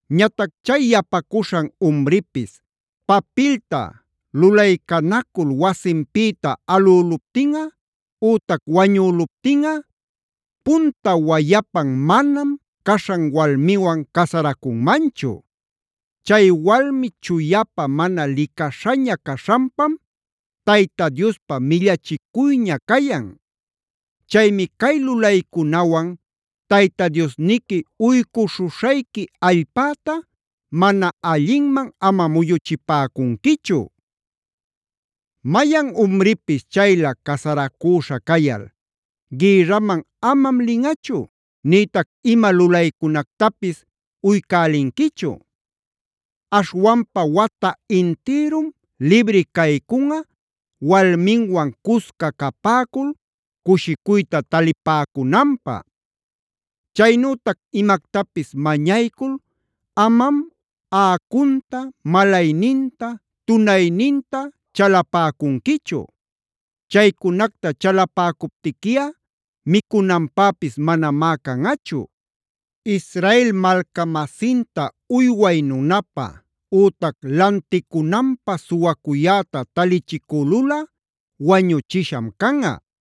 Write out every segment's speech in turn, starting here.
Ñatac chay yapacuśhan umripis papilta lulaycanacul wasinpïta alüluptinꞌa ütac wañüluptinꞌa, punta wayapan manam caśhan walmiwan casaracunmanchu. Chay walmi chuyapä mana licaśhaña caśhanpam Tayta Diospa millachicuyña cayan. Chaymi cay lulaycunawan Tayta Diosniqui uycuśhuśhayqui allpäta mana allinman ama muyuchïpäcunquichu. “Mayan umripis chaylä casaracüśha cayal gïrraman amam linꞌachu, nïtac ima lulaycunactapis uycälinquichu. Aśhwanpa wata intïrum libri caycunꞌa walminwan cusca capäcul cushicuyta talipäcunanpä. “Chaynütac imactapis mañaycul amam aꞌacunta, malayninta, tunayninta chalapäcunquichu. Chaycunacta chalapäcuptiquiꞌa micunanpäpis manamá canꞌachu. “Israel malca-masinta uyway nunapä ütac lanticunanpä suwacuyäta talichicülulꞌa wañuchisham canꞌa.b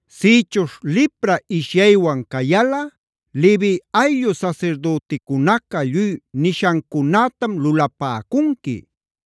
“Sïchuśh lipra ishyaywan cayalꞌa Levi ayllu sasirdüticunaca lluy nishancunätam lulapäcunqui.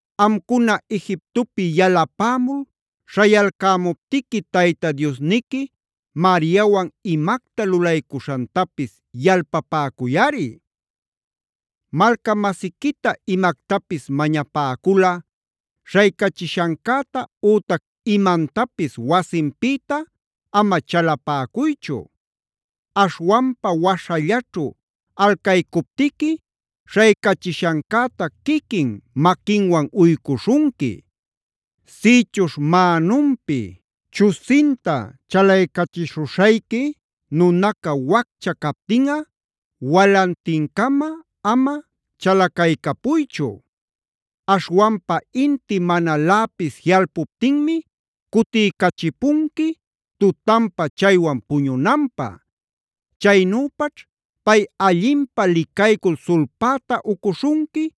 Amcuna Egiptopi yalapämul śhayalcämuptiqui Tayta Diosniqui Mariawane imacta lulaycuśhantapis yalpapäcuyꞌari.f “Malca-masiquita imactapis mañapäculꞌa śhaycachishancäta ütac imantapis wasinpïta ama chalapäcuychu. Aśhwanpa waśhallaćhu alcaycuptiqui śhaycachishancäta quiquin maquinwan uycuśhunqui. Sïchuśh mänunpi chusinta chalaycachishuśhayqui nunaca waccha captinꞌa walantincama ama chalacaycapuychu. Aśhwanpa inti manaläpis jiꞌalpuptinmi cutiycachipunqui tutanpa chaywan puñunanpä. Chaynüpaćh pay allinpä licaycul sulpäta ucuśhunqui,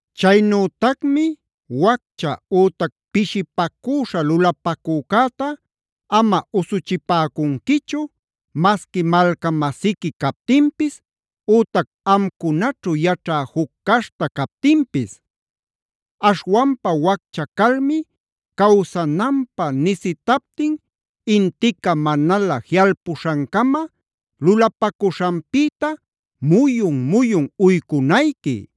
“Chaynütacmi waccha ütac pishipacüśha lulapacücäta ama usuchipäcunquichu, masqui malca-masiqui captinpis ütac amcunaćhu yaćhä juc caśhta captinpis. Aśhwanpa waccha calmi cawsananpä nisitaptin intica manalä jiꞌalpuśhancama lulapacuśhanpïta muyun-muyun uycunayqui.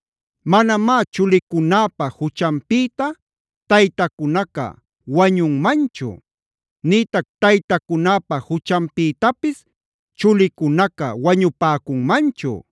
“Manamá chulicunäpa juchanpïta taytacunaca wañunmanchu; nïtac taytacunäpa juchanpïtapis chulicunaca wañupäcunmanchu.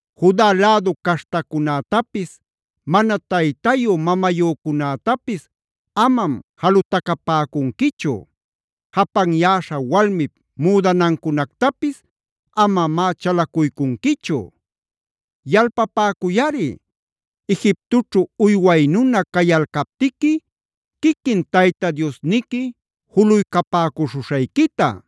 “Juc lädu caśhtacunätapis, mana taytayu mamayücunätapis amam jalutacapäcunquichu; japanyäśha walmip müdanancunactapis amamá chalacuycunquichu. Yalpapäcuyꞌari Egiptoćhu uyway nuna cayalcaptiqui quiquin Tayta Diosniqui juluycapäcuśhuśhayquita.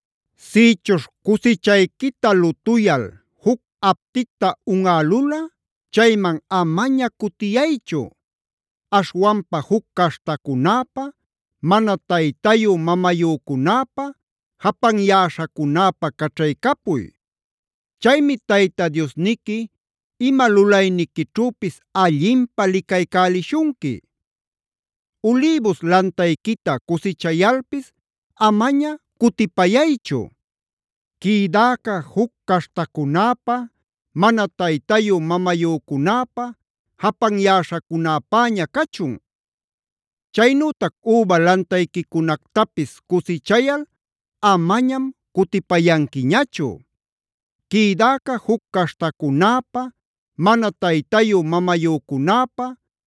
“Sïchuśh cusichayquita lutuyal juc apticta unꞌalulꞌa chayman amaña cutiyaychu. Aśhwanpa juc caśhtacunäpä, mana taytayu mamayücunäpä, japanyäśhacunäpä caćhaycapuy. Chaymi Tayta Diosniqui ima lulayniquićhüpis allinpä licaycälishunqui. “Ulïbus lantayquita cusichayalpis amaña cutipayaychu. Quïdäca juc caśhtacunäpä, mana taytayu-mamayücunäpä, japanyäśhacunäpäña cachun. “Chaynütac üba lantayquicunactapis cusichayal amañam cutipayanquiñachu. Quïdäca juc caśhtacunäpä, mana taytayu mamayücunäpä,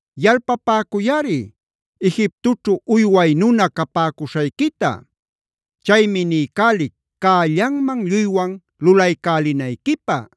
Yalpapäcuyꞌari Egiptoćhu uyway nuna capäcuśhayquita. Chaymi niycälic cällanman lluywan lulaycälinayquipä.